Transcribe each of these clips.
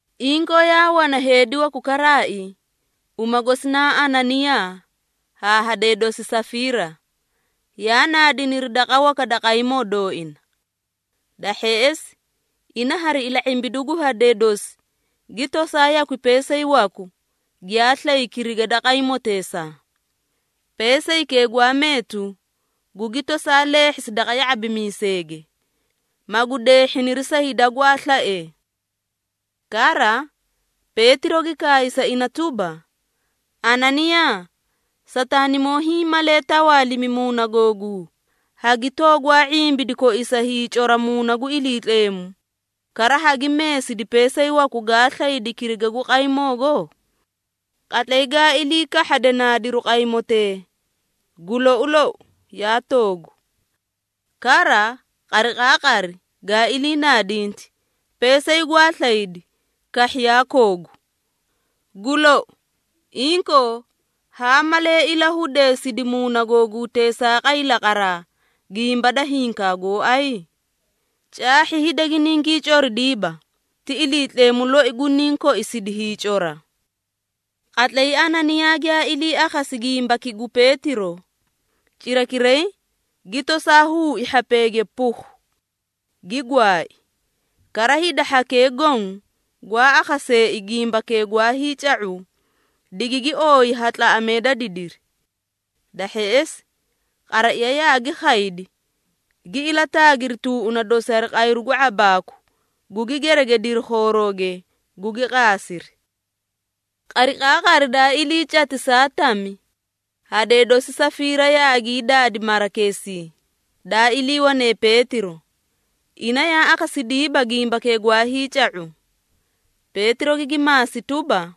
Inkoo yaa wana heedi waku karaai, uma gosi naa Ananiyaa haa hadee dosi Safiira, yaa naadiniri daqa waka da qaymoo dooina. Da hheꞌesi ina hari ila⁄imbidu gu hadee dosi gi tosaa yakwi peesay waku giyaa slay kiriga da qaymoteesaa. Peesaykee gwaa meetu, gugi tosaa leehhisi daqa ya⁄abimiiseege, magu deehhiniri sa hida gwaa slaee. Kara, Peetiro gi kaay sa ina tuba, “Ananiyaa, Sataanimoo hiĩ malee tawaalimi muuna googuu, hagi toogwaa ⁄imbidi koisa hiicora Muuna gu Iliitleemu, kara hagi meesidi peesay waku gaa slaydi kiriga gu qaymoogo? Qatlay gaa ilii kahhade naadiru qaymotee, gu lou lou yaa toogu! Kara qariqaaqari gaa ilii naadinti, peesay gwaa slaydi kahhi yaa koogu. Gu lou! Inkoo, haa malee ilahudeesidi muuna googuu teesaaqay laqaraa gimba da hinkaa gooay? Caahhi hida giningii coridiiba, ti Iliitleemu loi guniĩ koisidi hiicora.” Qatlay Ananiyaa giyaa ilii akhasi gimbaki gu Peetiro, cirakiray gi tosaa huui hhapeege pukhu! Gi gwaai. Kara hida hhakee goõ gwaa akhaseei gimbakee gwaa hiica⁄u, digigi ooyi ha tlaꞌamee da didiri. Da hheꞌesi qaraiya yaagi khaydi, gi ilataagiri tuuꞌuna dosi hari qayru gu ⁄abaaku, gugi geregediri khoorooge, gugi qaasiri. Qariqaaqari daa ilii cati saa tami, hadee dosi Safiira yaagii daadi marakeesii daa iliiwane Peetiro, ina yaa akhasidiiba gimbakee gwaa hiica⁄u. Peetiro gigi maasi tuba,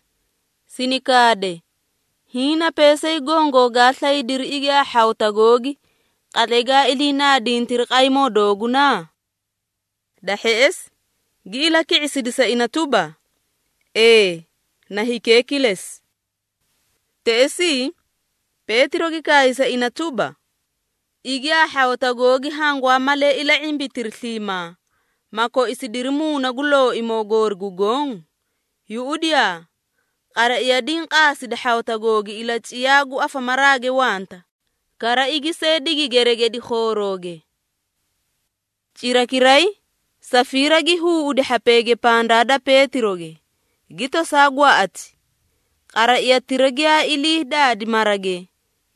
“Sini kaade, hiĩ na peesay gongoo gaa slaydiri igi haa hhawata googi, qatlay gaa ilii naadintiri qaymoo dooguna?” Da hheꞌesi gi ilaki⁄isidi sa ina tuba, “Ee, na hikee kilesi.” Teꞌesii Peetiro gi kaay sa ina tuba, “Igi haa hhawata googi hangwaa malee ila⁄imbitiri sliimaa, ma koisidiri Muuna gu Looimoo goori gu Goõ? Yuꞌudiyaa! Qaraiya diĩ qaasidi hhawata googi ilaciyaa gu afamaraage wanta, kara igi see digi geregedi khoorooge.” Cirakiray Safiira gi huuꞌudi hhapeege pandaa da Peetiroge, gi tosaa gwaꞌati. Qaraiyatira giyaa ilii daadi marage,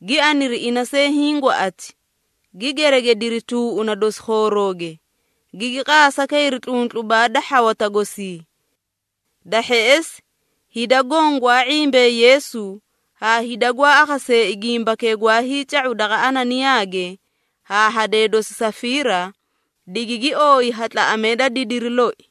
gi aniri ina see hiĩ gwaꞌati, gi geregediri tuuꞌuna dosi khoorooge, gigi qaasa kayri tluntlubaa da hhawata gosii. Da hheꞌesi hida goõ gwaa ⁄imbee Yeesu haa hida gwaa akhaseei gimbakee gwaa hiica⁄u daqa Ananiyaage haa hadee dosi Safiira, digigi ooyi ha tlaꞌamee da didiri loi.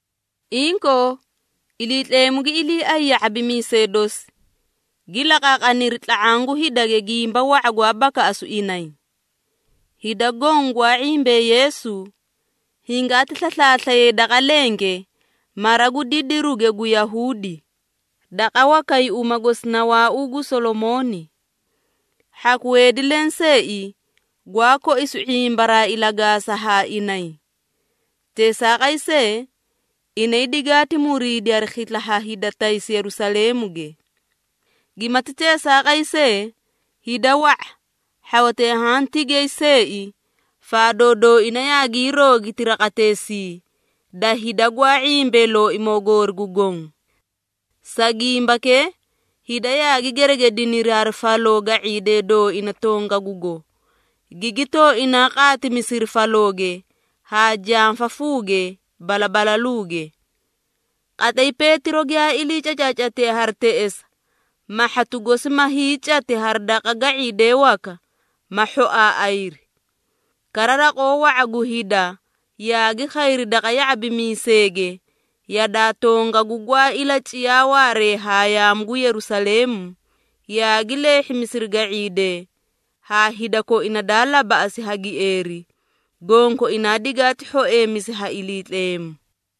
Inkoo, Iliitleemu gi iliiay ya⁄abimiisee dosi, gi laqaaqaniri tla⁄aã gu hidage gimba wa⁄a gwaa bakaꞌasu inay. Hida goõ gwaa ⁄imbee Yeesu, hingaati slaslaaslayay daqa lenge mara gu didiruge gu Yahuudi, daqa wakay uma gosi na “Waauu gu Solomooni.” Hhaku heedi lenseei gwaa koisu ⁄imbaraa ilagaasa haa inay. Teesaaqay see, inay digaati muriidi hari khisla ha hida taysi Yerusaleemuge. Gimati teesaaqay see, hida wa⁄a, hhawatee haã tigay seei faadoo dooina yaagii roogiti raqateesii da hida gwaa ⁄imbee Looimoo goori gu Goõ. Sa gimbakee, hida yaagi geregediniri hari faloo ga⁄iidee dooina tongagugo, gigi tooinaa qaatimisiri falooge haa janfafuuge balabalaluuge. Qatlay Peetiro giyaa ilii cacaacatiye hari teꞌesa, mahhatu gosi ma hiicati hari daqa ga⁄iidee waka, ma hhoaaꞌayri. Kara raqoo wa⁄a gu hida yaagi khayri daqa ya⁄abimiiseege yadaa tongagu gwaa ilaciyaa waaree haa yaamu gu Yerusaleemu, yaagi leehhimisiri ga⁄iidee haa hida koina daa labaꞌasi ha gieeri, gonkoinaa digaati hhoeemisi ha Iliitleemu.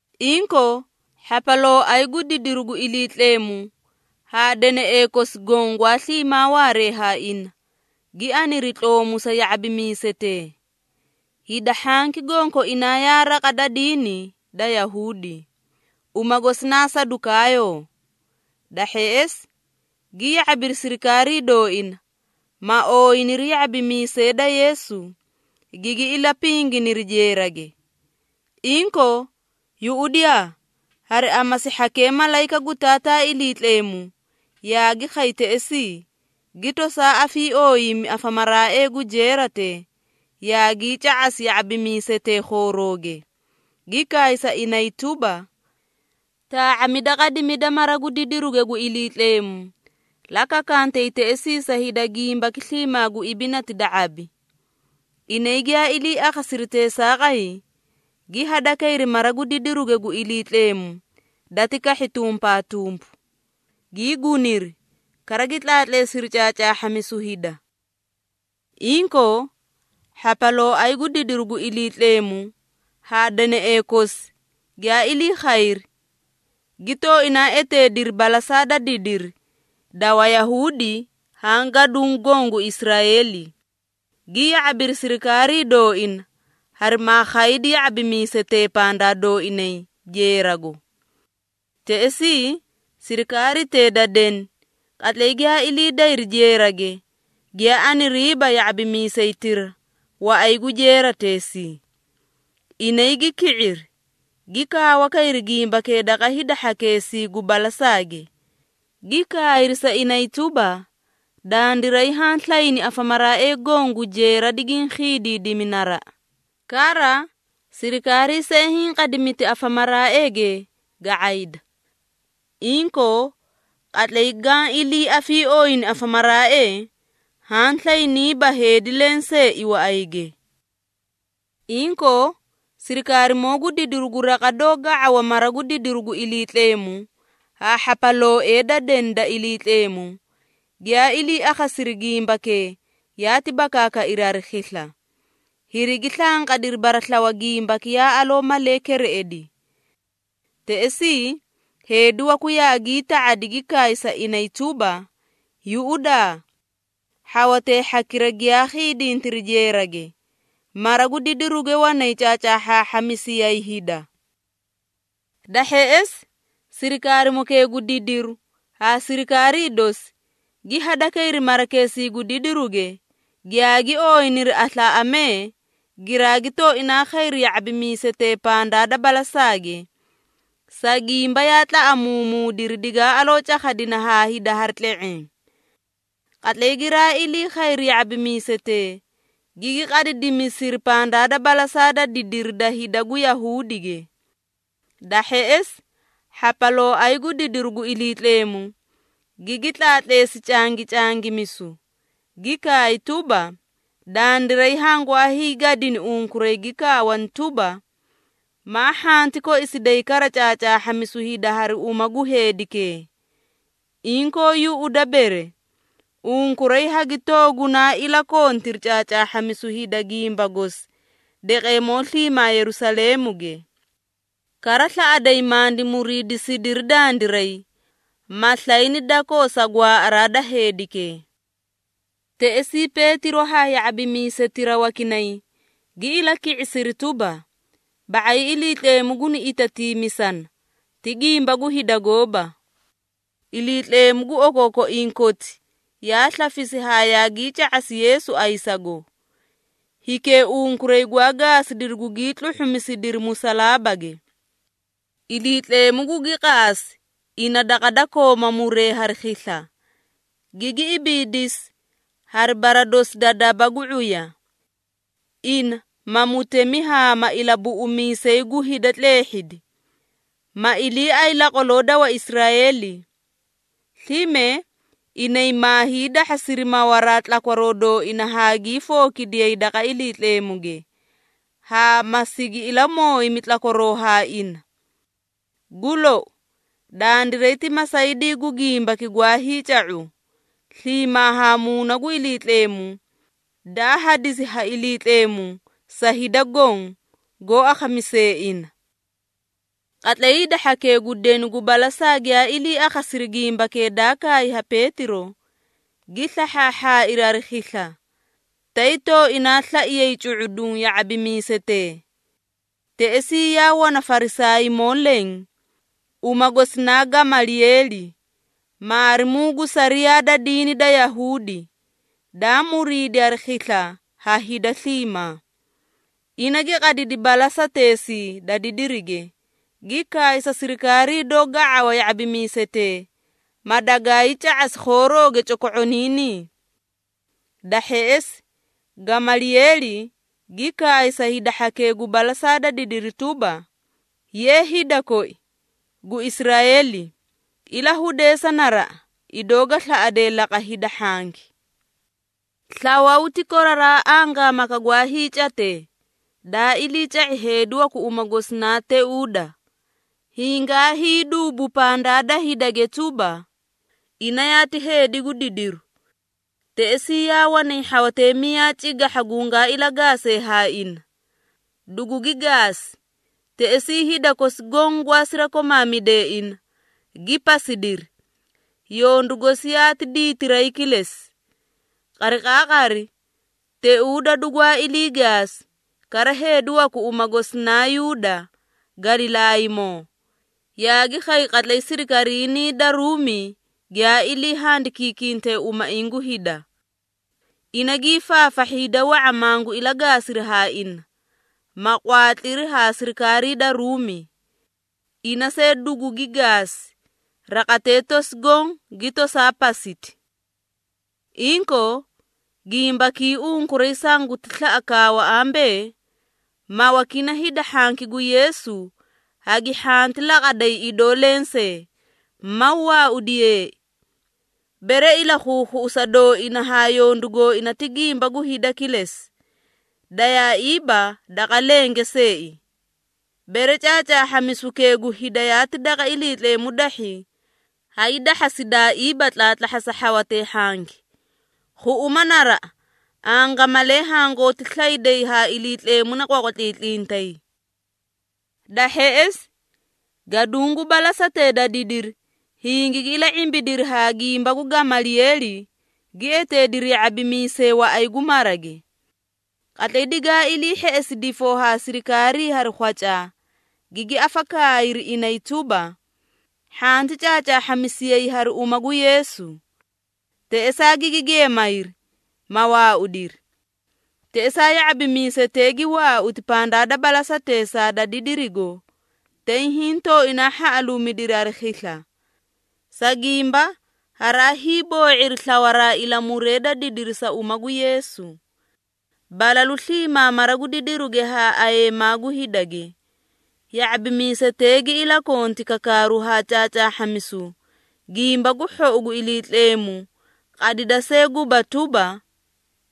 Inkoo hhapalooay gu didiru gu Iliitleemu haa deneꞌee kosi goõ gwaa sliimaa waaree ha ina, gi aniri tloomu sa ya⁄abimiisetee. (Hida hhanki gonkoinaa yaa raqa da diini da Yahuudi, uma gosi na Sadukaayoo). Da hheꞌesi gi ya⁄abiri sirikaarii dooina, ma ooyiniri ya⁄abimiisee da Yeesu, gigi ilapinginiri jeerage. Inkoo yuꞌudiyaa, hari amasi hhakee malayika gu Taataa Iliitleemu yaagi khay teꞌesii, gi tosaa afiiooyimi afamaraaee gu jeeratee, yaagii ca⁄asi ya⁄abimiisetee khoorooge, gi kaay sa inay tuba, “Taa⁄amida qadimida mara gu didiruge gu Iliitleemu, la kakantay teꞌesii sa hida gimbaki sliimaa gu ibinati da ⁄abi.” Inay giyaa ilii akhasiri teesaaqay, gi hadakayri mara gu didiruge gu Iliitleemu dati kahhi tumpaatumpu, gii guniri, kara gi tlaatleesiri caacaahhamisu hida. Inkoo hhapalooay gu didiru gu Iliitleemu haa deneꞌee kosi giyaa ilii khayri, gi tooinaa eteediri balasaa da didiri da Wayahuudi haa gaduũ goõ gu Israeeli, gi ya⁄abiri sirikaarii dooina harimaa khaydi ya⁄abimiisetee pandaa dooinay jeerago. Teꞌesii sirikaaritee da deni qatlay giyaa ilii dayri jeerage, giyaa aniriiba ya⁄abimiisaytira waꞌay gu jeerateesii. Inay gi ki⁄iri, gi kaawa kayri gimbakee daqa hida hhakeesii gu balasaage, gi kayri sa inay tuba, “Dandiray haã slayni afamaraaee goõ gu jeera digiĩ khiidiidimi naraꞌa, kara sirikaarii see hinqadimiti afamaraaeege ga⁄ayda. Inkoo qatlay gaã ilii afiiooyini afamaraaee haã slayniiba heedi lenseei waꞌayge.” Inkoo, sirikaarimoo gu didiru gu raqa doó ga⁄awa mara gu didiruge gu Iliitleemu haa hhapalooee da deni da Iliitleemu, giyaa ilii akhasiri gimbakee yaati bakaakairi hari khisla, hirigi slanqadiri baraslawa gimbaki yaa aloo malee kereꞌedi. Teꞌesii heedi waku yaagii ta⁄adi gi kaay sa inay tuba, “Yuꞌudaa! Hhawatee hhakira giyaa khiidintiri jeerage, mara gu didiruge wanay caacaahhaahhamisiyay hida.” Da hheꞌesi sirikaarimokee gu didiru haa sirikaarii dosi, gi hadakayri marakeesii gu didiruge, giyaagi ooyiniri aslaaꞌamee, giraagi tooinaa khayri ya⁄abimiisetee pandaa da balasaage, sa gimba yaa tlaꞌamuumuudiri digaa aloo cakhadina ha hida hari tle⁄eẽ. Qatlay giraa ilii khayri ya⁄abimiisetee, gigi qadidimisiri pandaa da balasaa da didiri da hida gu Yahuudige. Da hheꞌesi hhapalooay gu didiru gu Iliitleemu, gigi tlaatleesi cangicangimisu, gi kaay tuba, “Dandiray hangwaa hiigadini unkuray gi kaawani tuba, ‘Maa hhanti koisiday kara caacaahhamisu hida hari uma gu heedikee!’ Inkoo yuꞌuda bere, unkuray hagi toogunaa ilakontiri caacaahhamisu hida gimba gosi daqeemoo sliimaa Yerusaleemuge. Kara slaꞌaday mandi muriidisidiri dandiray, ma slayni dakoo sa gwaaꞌaraa da heedikee.” Teꞌesii Peetiro haa ya⁄abimiisetira wakinay gi ilaki⁄isiri tuba, “Ba⁄ay Iliitleemu guni itatiimisana, ti gimba gu hida gooba. Iliitleemu gu okookoiĩ koti yaa slafisi haa yaagii ca⁄asi Yeesu ayisago, hikee unkuray gwaa gaasidiri gugii tluhhumisidiri musalaabage. Iliitleemu gugi qaasi ina daqa da kooma muree hari khisla, gigi ibiidisi hari bara dosi da daba gu ⁄uya. Ina ma Mutemi haa ma Ilabuꞌumiisay gu hida tleehhidi, ma iliiay laqwaloo da Waisraeeli. Slime, inay maa hiidahhasiri mawaraa tlakwaroo dooina haa gii fookidiyay daqa Iliitleemuge, haa ma sigi ilamooyimi tlakwaroo ha ina. Gu lou, dandiray ti masaydii gu gimbaki gwaa hiica⁄u, sliimaa ha Muuna gu Iliitleemu daa hadisi ha Iliitleemu sa hida goõ, goó akhamisee ina.” Qatlay hida hhakee gu deni gu balasaa giyaa ilii akhasiri gimbakee daa kaay ha Peetiro, gi slahhaahhaairi hari khisla, tay tooinaa slaiyay cu⁄uduũ ya⁄abimiisetee. Teꞌesii yaa wana Farisaaymoo leẽ, uma gosi naa Gamalieeli, maarimuu gu sariyaa da diini da Yahuudi, daa muriidi hari khisla ha hida sliimaa. Ina gi qadidi balasateesii da didirige, gi kaay sa sirikaarii doó ga⁄awa ya⁄abimiisetee, madagay ca⁄asi khoorooge coko⁄oniinii. Da hheꞌesi, Gamalieeli gi kaay sa hida hhakee gu balasaa da didiri tuba, “Ye! Hida koi gu Israeeli, ilahudeesa naraꞌa idoo ga slaꞌadee laqa hida hhanki! Slawaw ti koraraa angaamaka gwaa hiicatee, daa iliica⁄i heedi waku uma gosi naa Teuuda, hingaa hiiduubu pandaa da hidage tuba, ina yaati heedi gu didiru. Teꞌesii yaa wanay hhawatee miyaa cigahha gungaa ilagaasee haa ina. Dugugi gaasi, teꞌesii hida kosi goõ gwaa sirakomaamidee ina, gi pasidiri, yondu gosi yaati diitiray kilesi. Qariqaaqari Teuuda dugwaa ilii gaasi, kara heedi waku uma gosi naa Yuuda Galilaaymoo, yaagi khay qatlay sirikariinii da Ruumi giyaa ilii handikiikinte umaiĩ gu hida. Ina gii faafahhi hida wa⁄a mangu ilagaasiri ha ina, ma qwaatliri haa sirikaarii da Ruumi. Ina see dugugi gaasi, raqatee tosi goõ gi tosaa pasiti. Inkoo, gimbakii unkuray sanguti slaꞌa kaawa ambee, mawakini hida hhanki gu Yeesu hagi hhanti laqaday idoo lensee, maw waaudiyee. Bere ilakhuukhuꞌusa dooina haa yondu gooina ti gimba gu hida kilesi, dayaaiiba daqa lenge seei. Bere caacaahhamisukee gu hida yaati daqa Iliitleemu dahhi, hay dahhasidaaiiba tlaatlahhasa hhawatee hhanki. Khuꞌuma naraꞌa angamalee hangooti slayday haa Iliitleemu na qwaqwatlintlitay!” Da hheꞌesi gaduũ gu balasatee da didiri hingigi ila⁄imbidiri haa gimba gu Gamalieeli, gi eteediri ya⁄abimiisee waꞌay gu marage. Qatlay digaa ilii hheꞌesi difoo ha sirikaarii hari khwacaa, gigi afakaayiri inay tuba, hhanti caacaahhamisiyay hari uma gu Yeesu. Teꞌesaa gigi geemayri, ma waaudiri. Teꞌesaa ya⁄abimiisetee gi waauti pandaa da balasateesaa da didirigo, tay hiĩ tooinaa hhaꞌaluumidiri hari khisla, sa gimba haraa hiiboo⁄iri slawaraa ilamuree da didiri sa uma gu Yeesu. Balalu sliimaa mara gu didiruge haa ayeemaa gu hidage, ya⁄abimiisetee gi ilakonti kakaaru haa caacaahhamisu Gimba gu Hhou gu Iliitleemu qadida see guba tuba,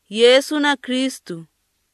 Yeesu na Kristu.